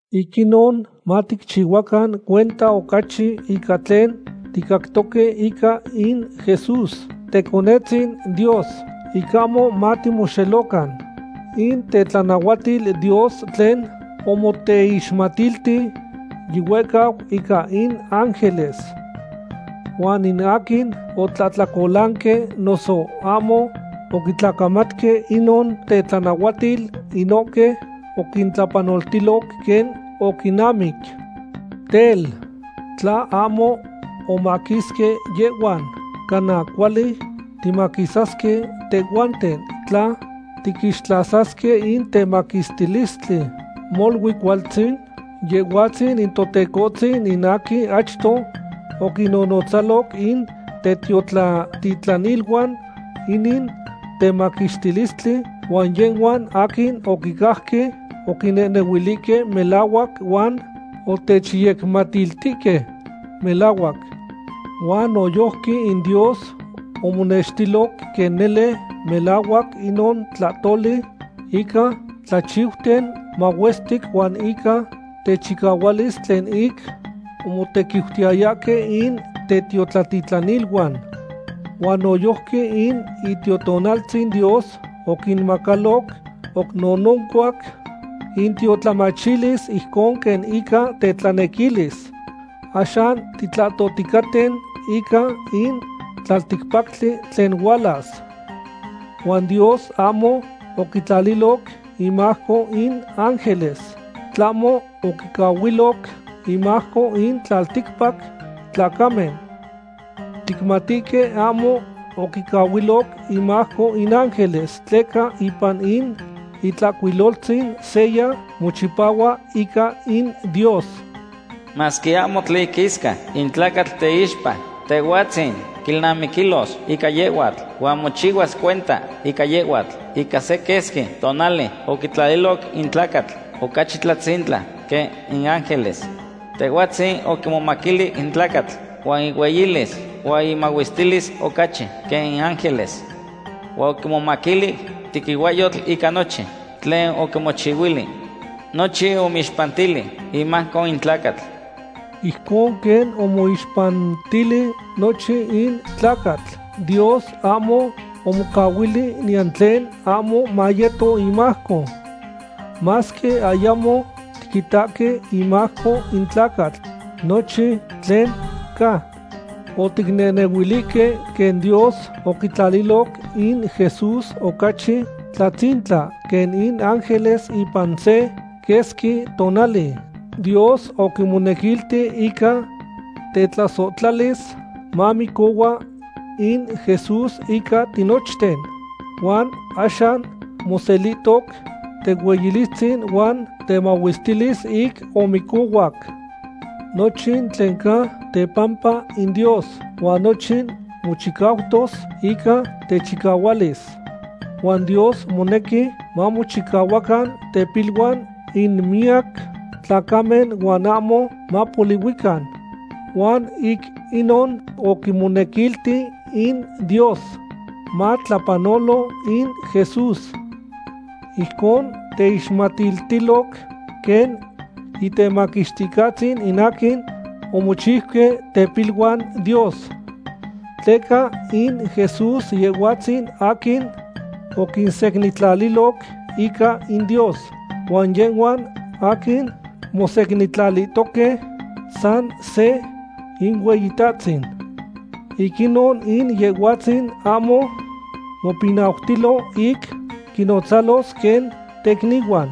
Ic inon maticchihuacan cuenta ocachi ica tlen ticactoque ica in Jesús, Teconetzin Dios, ic ahmo matimoxelocan. In tetlanahuatil Dios tlen omoteixmatilti yihuehcau ica in ángeles. Huan in aquin otlahtlacolanque noso ahmo oquitlacamatque inon tetlanahuatil, inohque oquintlapanoltiloc quen oquinamic. Tel, ¿tla ahmo omaquisque yehhuan, cana cuali timaquisasque tehhuanten tla tiquixtlasasque in temaquixtilistli molui cualtzin? Yehhuatzin in Totecohtzin in aquin achto oquinnonotzaloc in tetiotlatitlaniluan inin temaquixtilistli, huan yehhuan aquin oquicajque oquinehnehuilihque melahuac huan otechyecmatiltihque melahuac. Huan noyojqui in Dios omonextiloc quen nele melahuac inon tlahtoli ica tlachiuten mahuestic huan ica techicahualis tlen ic omotequiutiyayahque in tetiotlatitlaniluan. Huan noyojqui in Itiotonaltzin Dios oquinmacaloc oc nononcuac intiotlamachilis ijcon quen ica tetlanequilis. Axan titlahtohticaten ica in tlalticpactli tlen hualas. Huan Dios ahmo oquitlaliloc inmajco in ángeles, tlahmo oquicahuiloc inmajco in tlalticpac tlacamen. Ticmatihque ahmo oquicahuiloc inmajco in ángeles tleca ipan in Itlahcuiloltzin seya mochipahua ica in Dios: Masque ahmo tlen iquisca in tlacatl teixpa, Tehhuatzin quilnamiquilos ica yehhuatl, huan mochihuas cuenta ica yehhuatl. Ica se quesqui tonali oquitlaliloc in tlacatl ocachi tlatzintla quen in ángeles. Tehhuatzin oquimomaquilic in tlacatl huan ihueyilis huan imahuestilis ocachi quen in ángeles. Huan oquimomaquilic tequihuahyotl ica nochin tlen oquimochihuili. Nochin omoixpantili imajco in tlacatl. Ijcon quen omoixpantili nochin in tlacatl, Dios ahmo omocahuili niyan tlen ahmo mayeto imajco. Masque ayamo tiquitahque imajco in tlacatl nochin tlen ca. Oticnehnehuilihque quen Dios oquitlaliloc in Jesús ocachi tlatzintla quen in ángeles ipan se quesqui tonali. Dios oquimonequilti ica tetlasohtlalis mamicohua in Jesús ica tinochten. Huan axan moselihtoc tehueyilistzin huan temahuestilis ic omicohuac. Nochin tlen ca tepampa in Dios, huan nochin mochicautos ica techicahualis. Huan Dios monequi mamochihuacan tepiluan in miyac tlacamen huan ahmo mapolihuican. Huan ic inon oquimonequilti in Dios matlapanolo in Jesús. Ijcon teixmatiltiloc quen Intemaquixticahtzin in aquin omochiuque tepiluan Dios. Tleca in Jesús Yehhuatzin aquin oquinsecnintlaliloc ica in Dios, huan yehhuan aquin mosecnintlalihtoque, san se Inueyitahtzin. Ic inon in Yehhuatzin ahmo mopinautilo ic quinnotzalos quen tecnihuan.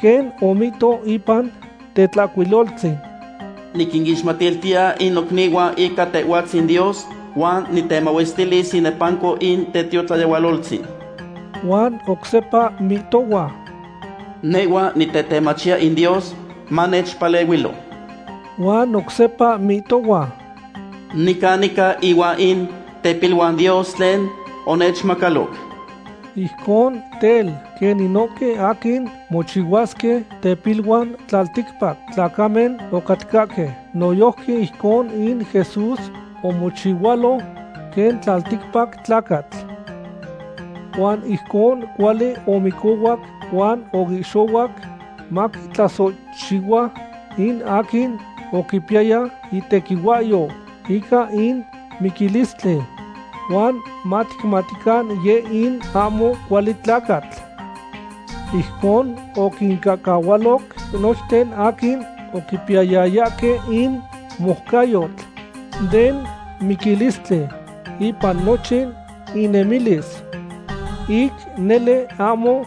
Quen omihto ipan Tetlahcuiloltzin: Niquinixmatiltiya in nocnihuan ica Tehhuatzin Dios, huan nitemahuestilis inepanco in tetiotlayehualoltzin. Huan oc sepa mihtohua: Nehhua nitetemachiya in Dios manechpalehuilo. Huan oc sepa mihtohua: Nican nica ihuan in tepiluan Dios tlen onechmacaloc. Ijcon tel, quen inohque aquin mochihuasque tepiluan tlalticpac tlacamen ocatcahque, noyojqui ijcon in Jesús omochihualo quen tlalticpac tlacatl. Huan ijcon cuali omicohuac huan oihxohuac maquitlasohchihua in aquin oquipiyaya itequihuahyou ica in miquilistli. Huan maticmatican yeh in ahmo cuali tlacatl. Ijcon oquincahcahualoc nochten aquin oquipiyayahque in moucayotl den miquilistli ipan nochin inemilis. Ic nele ahmo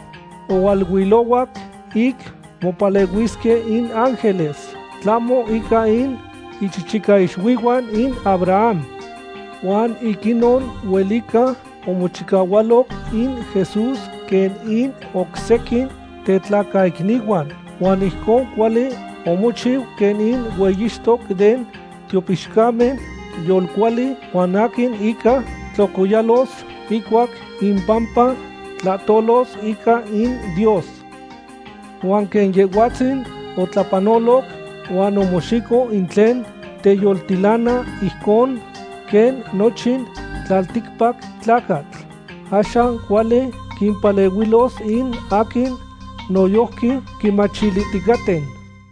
ohualuilohuac ic mopalehuisque in ángeles, tlahmo ica in ichichicaixuihuan in Abraham. Huan ic inon huelica omochihualoc in Jesús quen in oc sequin tetlacaicnihuan, huan ijcon cuali omochiu quen in hueyixtoc den tiopixcamen yolcuali huan aquin inca tlocoyalos ihcuac impampa tlahtolos ica in Dios. Huan quen Yehhuatzin otlapanoloc huan omoxico in tlen teyoltilana ijcon quen nochin tlalticpac tlacatl, axan cuali quimpalehuilos in aquin noyojqui quimachilihticaten.